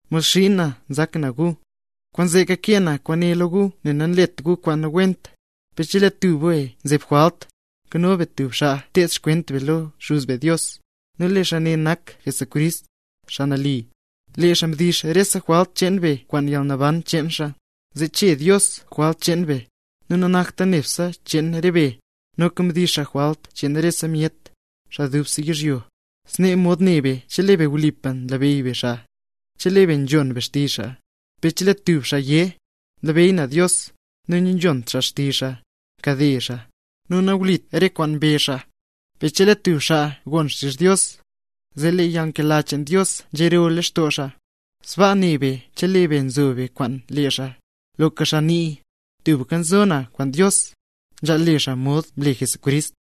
Mod xiin na nzak na gu, kwaanzee kakee na kwaane lo gu zee nalet gu kwaan nawent. Per chelee tub be zeb jwalt, nkano be tub xaa nted xkwent be lo Xuz be Dios, lee xaa ne nak Jesucrist, Xaa Nali. Lee xaa mdix rese jwalt cheen be kwaan yalnaban cheen xaa, zee chee Dios jwalt cheen be; nu nanakta nebse cheen re be, noka mdix xaa jwalt cheen rese myet, xaa dubse yizhyo. Snee mod ne be, chelee be wlipa nlabeyy be xaa, chelee be nzhon be xtizh xaa. Per chelee tub xaa yé: “Nlabeyy na Dios”, nu nanzhont xaa xtizh xaa, nkade xaa; nu nawlit re kwaan mbezh xaa. Per chelee tub xaa gon xtizh Dios, zee lee yalnkela cheen Dios nzhero leen lextoo xaa. Sbaa ne be chelee be nzo be kwaan lee xaa. Loka xaa nii: “Tubka nzo na kwaan Dios”, nzhaal le xaa mod mle Jesucrist.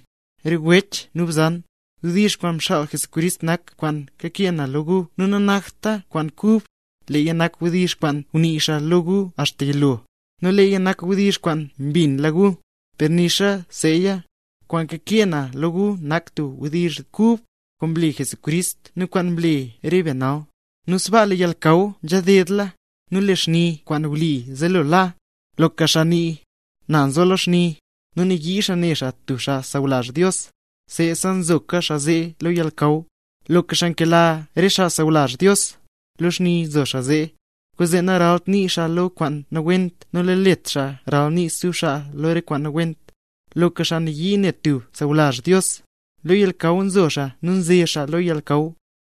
Re wech nu bzan, wdizh kwaan mxaal Jesucrist nak kwaan kakee na lo gu nu nanakta kwaan kub, leeya nak wdizh kwaan ngunii xaa lo gu axta yilo, nu leeya nak wdizh kwaan mbinla gu. Per nixa seeya, kwaan kakee na lo gu nak tub wdizh kub; kwaan mle Jesucrist nu kwaan nle re be nal, nu sbaa lee yalnakaw nzhadedla, nu lee xni kwaan wli nzelo la. Loka xaa nii: “Na nzo lo xni”, nu nayii xaa ne xaa tub xaa sawlazh Dios, seesa nzoka xaa zee lo yalnakaw. Loka xaa nkela re xaa sawlazh Dios, lo xni nzo xaa zee; kwaanzee naralt nii xaa lo kwaan nawent nu nalet xaa ralnii stub xaa lo kwaan nawent. Loka xaa nayii ne tub sawlazh Dios, lo yalnakaw nzo xaa nu nze xaa lo yalnakaw,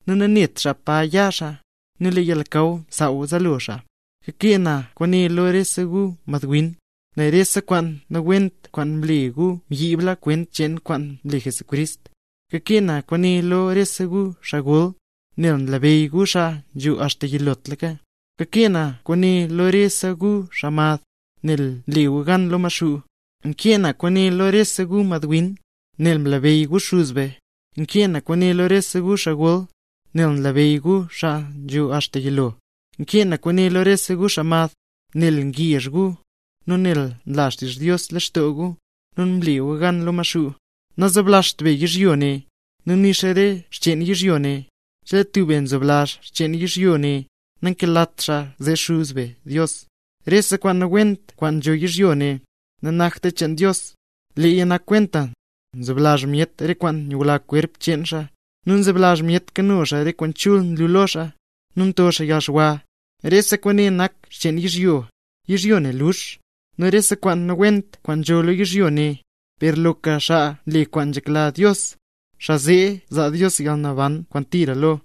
nu nanet xaa pa ya xaa, nel lee yalnakaw msaaw zaalo xaa. Kakee na kwaane lo rese gu madwin, nel rese kwaan nawent kwaan mle gu mbyiibla kwent cheen kwaan mle Jesucrist. Kakee na kwaane lo rese gu xaa gol, nel nlabeyy gu xaa nzho axta yilotlaka. Kakee na kwaane lo rese gu xaa mad, nel mle gu gan lo Maxuu. Nkee na kwaane lo rese gu madwin, nel mlebeyy gu Xuz be. Nkee na kwaane lo rese gu xaa gol, nel nlabeyy gu xaa nzo axta yilotlaka. Nkee na kwaane lo rese gu xaa mad, nel ngezh gu, nu nel nla xtizh Dios lextoo gu, nu mle gu gan lo Maxuu. Nazoblazht be yizhyo ne, nu nixa re xcheen yizhyo ne. Chelee tub be nzoblazh xcheen yizhyo ne, nankelat xaa zee Xuz be Dios. Rese kwaan nawent kwaan nzho yizhyo ne, nanakta cheen Dios; leeya nak kwenta nzoblazh myet re kwaan nyula kwerp cheen xaa, nu nzoblazh myet kano re kwaan chul nlu lo xaa, nu nto xaa yalxwa; rese kwaane nak xcheen yizhyo. Yizhyo ne lux, nu rese kwaan nawent kwaan nzho lo yizhyo ne; per loka xaa nle kwaana nzhekla Dios, xaa zee zaa Dios yalnaban kwaan tira lo.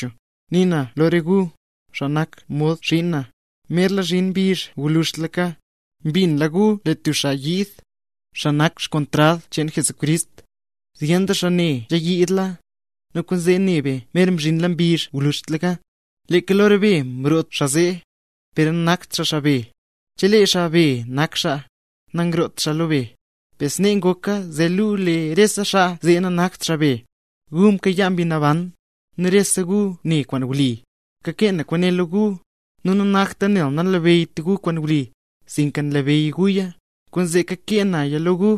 Nii na lo rese gu, xaa nak mod xiin na, merla mzhin mbizh gwluzhtlaka. Mbinla gu lee tub xaa yiid, xaa nak kontrad cheen Jesucrist; zyen doo xaa snee nzhayiidla, nu kwaanzee ne be mer mzhinla mbizh gwluzhtlaka. Leeka lo re be mroo xaa zee, per nanakt xaa xaa be. Chelee xaa be nak xaa, nangroot xaa lo be; per snee ngoka zee luu lee rese xaa zee nanakt xaa be. Gu mkayaa Mbi Naban, zee rese gu ne kwaan wli. Kakee na kwaane lo gu, nu nanakta nel nanlabeyyt gu kwaan wli, sinka nlabeyy guya, kwaanzee kakee naya lo gu.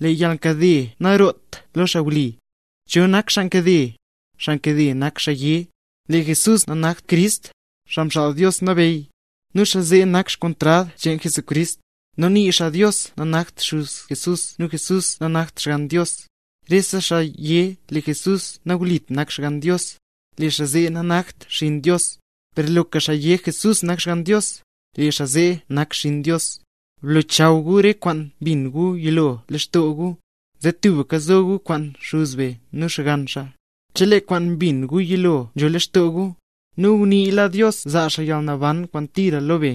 Lee yalnkade naroot lo xaa wli. ¿Cho nak xaa nkade? Xaa nkade nak xaa yé lee Jesús nanakt Crist, Xaa Mxaal Dios Nabeyy. Nu xaa zee nak kontrad cheen Jesucrist, nu nii xaa Dios nanakt xuz Jesús nu Jesús nanakt Xgann Dios. Rese xaa yé lee Jesús nawlit nak Xgann Dios, lee xaa zee nanakt xinn Dios; per loka xaa yé Jesús nak Xgann Dios, lee xaa zee nak xinn Dios. Blochaw gu re kwaan mbin gu yilo lextoo gu, zee tubka zo gu kwaan Xuz be nu Xgann xaa, chelee kwaan mbin gu yilo nzho lextoo gu. Nu nguniila Dios zaa xaa yalnaban kwaan tira lo be.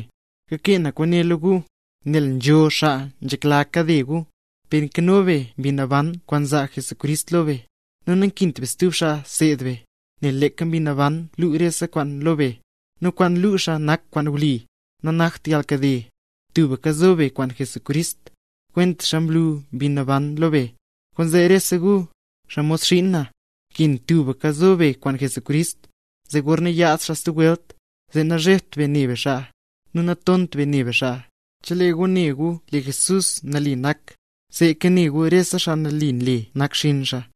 Kakee na kwaane lo gu, nel nzho xaa nzhekla kade gu. Per nzho Mbi Naban lextoo be nel mzaa Jesucrist Mbi Naban lo be, nu nankint be stub xaa seed be, nel leeka Mbi Naban luu rese kwaan lo be, nu kwaan luu xaa nak kwaan wli, nanakta yalnkade. Tubka zo be kwaan Jesucrist, kwentaxa mlu Mbi Naban lo be. Kwaanzee rese gu, xaa mod xiin na, nkin tubka zo be kwaan Jesucrist. Zee gorna yaad xaa stub welt, zee nazhebt be ne be xaa, nu natont be ne be xaa. Chelee gu ne gu lee Jesús nali nak, seeka ne gu rese xaa nali nle nak xinn xaa.